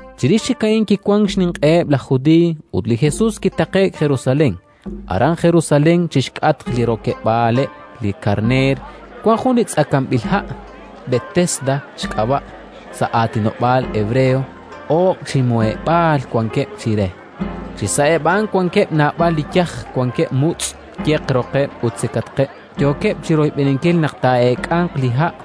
Chirix chik a'in kiwank xninq'eheb' laj Judiiy, ut li Jesus kitaqe'k Jerusalén. Aran Jerusalén, chi xk'atq li Rokeb'aaleb' li Karneer, wank jun li tz'akanb'il ha', Betesda xk'ab'a' sa' aatinob'aal hebreo; oob' chi muheb'aal wankeb' chire. Chi sa'eb' a'an wankeb' naab'al li yaj; wankeb' mutz', yeq roqeb' ut sikatqeb', yookeb' chi royb'eninkil naq taa'eek'anq li ha'.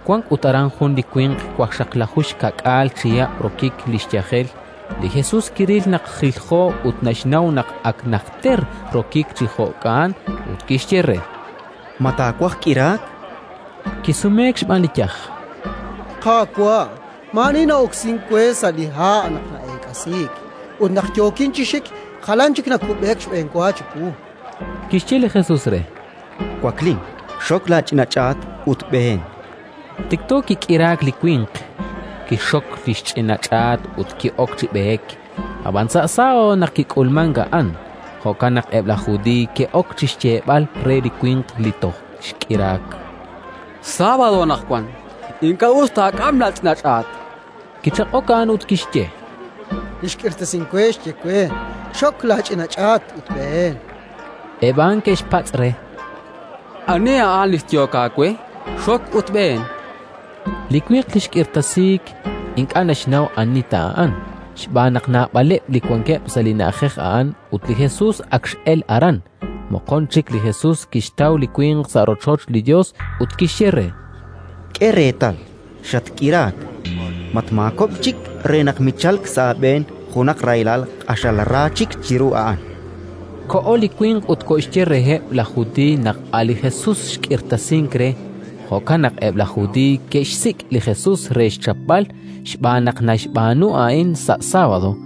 Wank ut aran jun li winq waqxaqlaju xka'k'aal chihab' rokik li xyajel. Li Jesus kiril naq jiljo ut naxnaw naq ak najter rokik chi jo'ka'an; ut kixye re: —Ma taawaj k'iraak? Kisumeek xb'aan li yaj: —Qaawa', maa'ani na'oksink we sa' li ha' naq na'eek'asiik; ut naq yookin chi xik, jalan chik nakub'eek xb'enwa chiwu. Kixye li Jesus re: —Waklin, xok laach'ina ch'aat ut b'een. Tikto kik'iraak li winq, kixxok li xch'ina ch'aat ut ki'ok chi b'eek. Ab'anan sábado naq kik'ulmank a'an. Jo'kan naq eb' laj Judiiy ke'ok chi xyeeb'al re li winq li toj xk'iraak: —Sábado anaqwan; ink'a' us taak'am laach'ina ch'aat. Kichaq'ok a'an ut kixye: —Li xk'irtasink we, xye we: «Xok laach'ina ch'aat ut b'een». Eb' a'an ke'xpatz' re: —Ani a'an li xyehok aawe: «Xok ut b'een»? Li winq li xk'irtasiik ink'a' naxnaw ani ta a'an, xb'aan naq naab'aleb' li wankeb' sa' li na'ajej a'an ut li Jesus ak x'elk aran. Moqon chik li Jesus kixtaw li winq sa' rochoch li Yos ut kixye re: —K'e reetal, xatk'iraak. Matmaakob'k chik re naq michalk sa' aab'een junaq rahilal q'axal ra chik chiru a'an. Koho li winq ut koxye reheb' laj Judiiy naq a' li Jesus xk'irtasink re. Jo'kan naq eb' laj Judiiy ke'xsik' li Jesus re xchapb'al, xb'aan naq naxb'aanu a'in sa' sábado.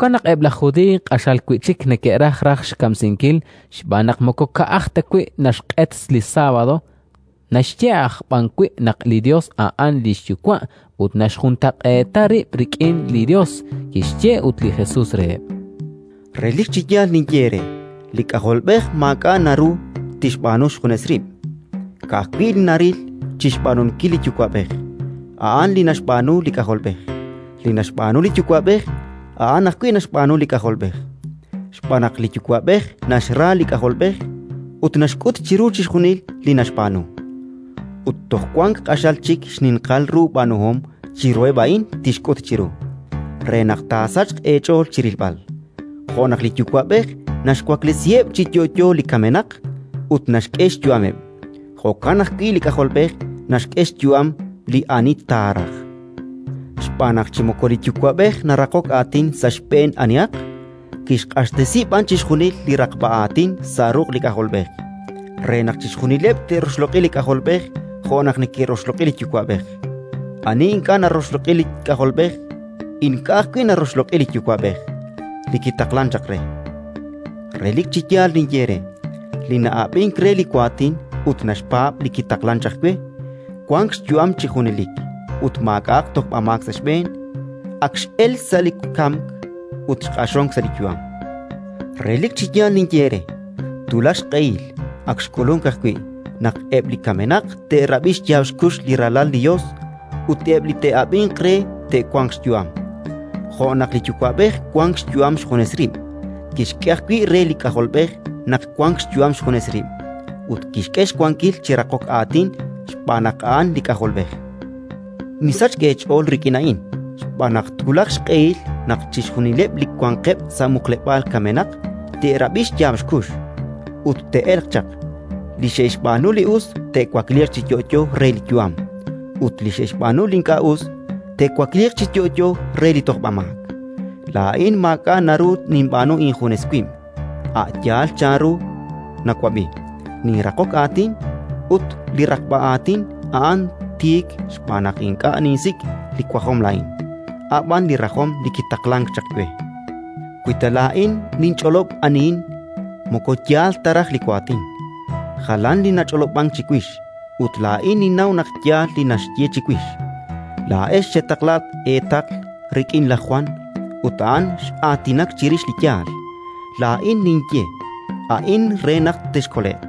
Jo'kan naq eb' laj Judiiy q'axal wi' chik neke'raj raj xkamsinkil xb'aan naq moko ka'aj ta wi' naxq'et li sábado, naxye aj b'an wi' naq li Yos a'an li xYuwa' ut naxjuntaq'eeta rib' rik'in li Yos. Kixye ut li Jesus reheb': “Relik chi yaal ninye eere: li K'ajolb'ej maak'a' naru tixb'aanu xjunes rib'; ka'ajwi' li naril chi xb'aanunkil li Yuwa'b'ej, a'an li naxb'aanu li K'ajolb'ej. Li naxb'aanu li Yuwa'b'ej, a'an ajwi' naxb'aanu li K'ajolb'ej. Xb'aan naq li Yuwa'b'ej naxra li K'ajolb'ej ut naxk'ut chiru chixjunil li naxb'aanu. Ut toj wank q'axal chik xninqal ru b'aanuhom chiruheb' a'in tixk'ut chiru, re naq taasachq eech'ool chi rilb'al. “Jo' naq li Yuwa'b'ej naxwaklesiheb' chi yo'yo li kamenaq ut naxk'e xyu'ameb', jo'kan ajwi' li K'ajolb'ej naxk'e xyu'am li ani taaraj. Xb'aan naq chi moko li Yuwa'b'ej naraqok aatin sa' xb'een anihaq, kixq'axtesi b'an chixjunil li raqb'a aatin sa' ruq' li K'ajolb'ej, re naq chixjunileb' te'roxloq'i li K'ajolb'ej jo' naq neke'roxloq'i li Yuwa'b'ej. Ani ink'a' naroxloq'i li K'ajolb'ej ink'a' ajwi' naroxloq'i li Yuwa'b'ej li kitaqlank chaq re. “Relik chi yaal ninye eere: li na'ab'ink re li waatin ut naxpaab' li kitaqlank chaq we, wank xyu'am chi junelik ut maak'a'aq tojb'amaak sa' xb'een; ak x'elk sa' li kamk ut xq'axonk sa' li yu'am. Relik chi yaal ninye eere: twulaq xq'ehil (ak xk'ulunk ajwi') naq eb' li kamenaq te'rab'i xyaab' xkux li Ralal li Yos, ut eb' li te'ab'inq re te'wanq xyu'am. Jo' naq li Yuwa'b'ej wank xyu'am xjunes rib', kixk'e ajwi' re li K'ajolb'ej naq wank xyu'am xjunes rib', ut kixk'e xwankil chi raqok aatin xb'aan naq a'an li K'ajolb'ej. “Misachk eech'ool rik'in a'in, xb'aan naq twulaq xq'ehil naq chixjunileb' li wanqeb' sa' muqleb'aal kamenaq te'rab'i xyaab' xkux ut te'elq chaq: li xe'xb'aanu li us te'wakliiq chi yo'yo re li yu'am, ut li xe'xb'aanu li ink'a' us te'wakliiq chi yo'yo re li tojb'amaak. “Laa'in maak'a' naru ninb'aanu injunes wib': a' yaal chanru nawab'i, ninraqok aatin, ut linraqb'a aatin a'an tiik xb'aan naq ink'a' ninsik' li wajom laa'in, a' b'an li rajom li kitaqlank chaq we. Wi ta laa'in ninch'olob' anihin, moko yaal ta raj li waatin. Jalan li nach'olob'ank chiwix, ut laa'in ninnaw naq yaal li naxye chiwix. “Laa'ex xetaqla eetaql rik'in laj Jwan ut a'an x'aatinak chirix li yaal. Laa'in ninye a'in re naq texkole'q,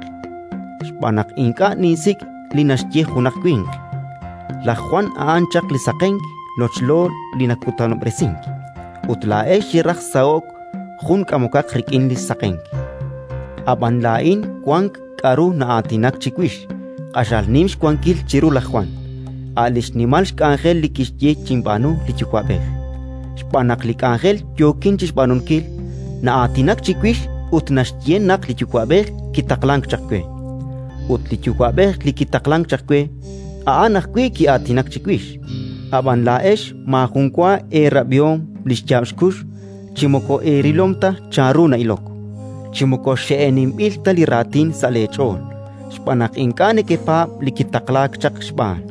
xb'aan naq ink'a' ninsik' li naxye junaq winq. Laj Jwan a'an chaq li saqenk lochlo li nakutanob'resink, ut laa'ex xeraj saho'k jun k'amokaq rik'in li xsaqenk. Ab'an laa'in wank k'aru na'aatinak chiwix q'axal nim xwankil chiru laj Jwan, a' li xnimal k'anjel li kixk'e chinb'aanu li Yuwa'b'ej. Xb'aan naq li k'anjel yookin chi xb'aanunkil na'aatinak chiwix ut naxye naq li Yuwa'b'ej kitaqlank chaq we. Ut li Yuwa'b'ej li kitaqlank chaq we, a'an ajwi' ki'aatinak chiwix. Ab'an laa'ex maajun wa eerab'ihom li xyaab' xkux, chi moko eerilom ta chanru na'ilok, chi moko xe'eninb'il ta li raatin sa' leech'ool, xb'aan naq ink'a' nekepaab' li kitaqlaak chaq xb'aan.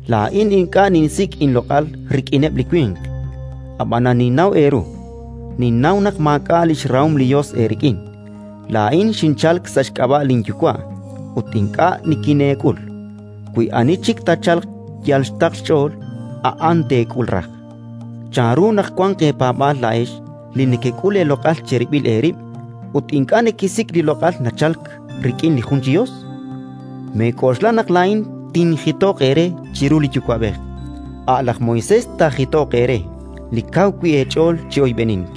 “Laa'in ink'a' ninsik' inloq'al rik'ineb' li winq; ab'anan ninnaw eeru, ninnaw naq maak'a' li xrahom li Yos eerik'in. Laa'in xinchalk sa' xk'ab'a' linYuwa', ut ink'a' nikineek'ul. Wi ani chik taachalq yal xtaql xch'ool, a'an teek'ul raj. Chanru naq wanq eepaab'aal laa'ex li nekek'ul eeloq'al cherib'il eerib' ut ink'a' nekesik' li loq'al nachalk rik'in li jun chi Yos? “Meek'oxla naq laa'in tinjitoq eere chiru li Yuwa'b'ej: a' laj Moisés taajitoq eere, li kaw wi' eech'ool chi oyb'enink.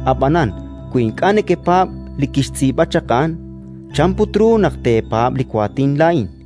Ab'anan, wi ink'a' nekepaab' li kixtz'iib'a chaq a'an, chan put ru naq teepaab' li waatin laa'in?”.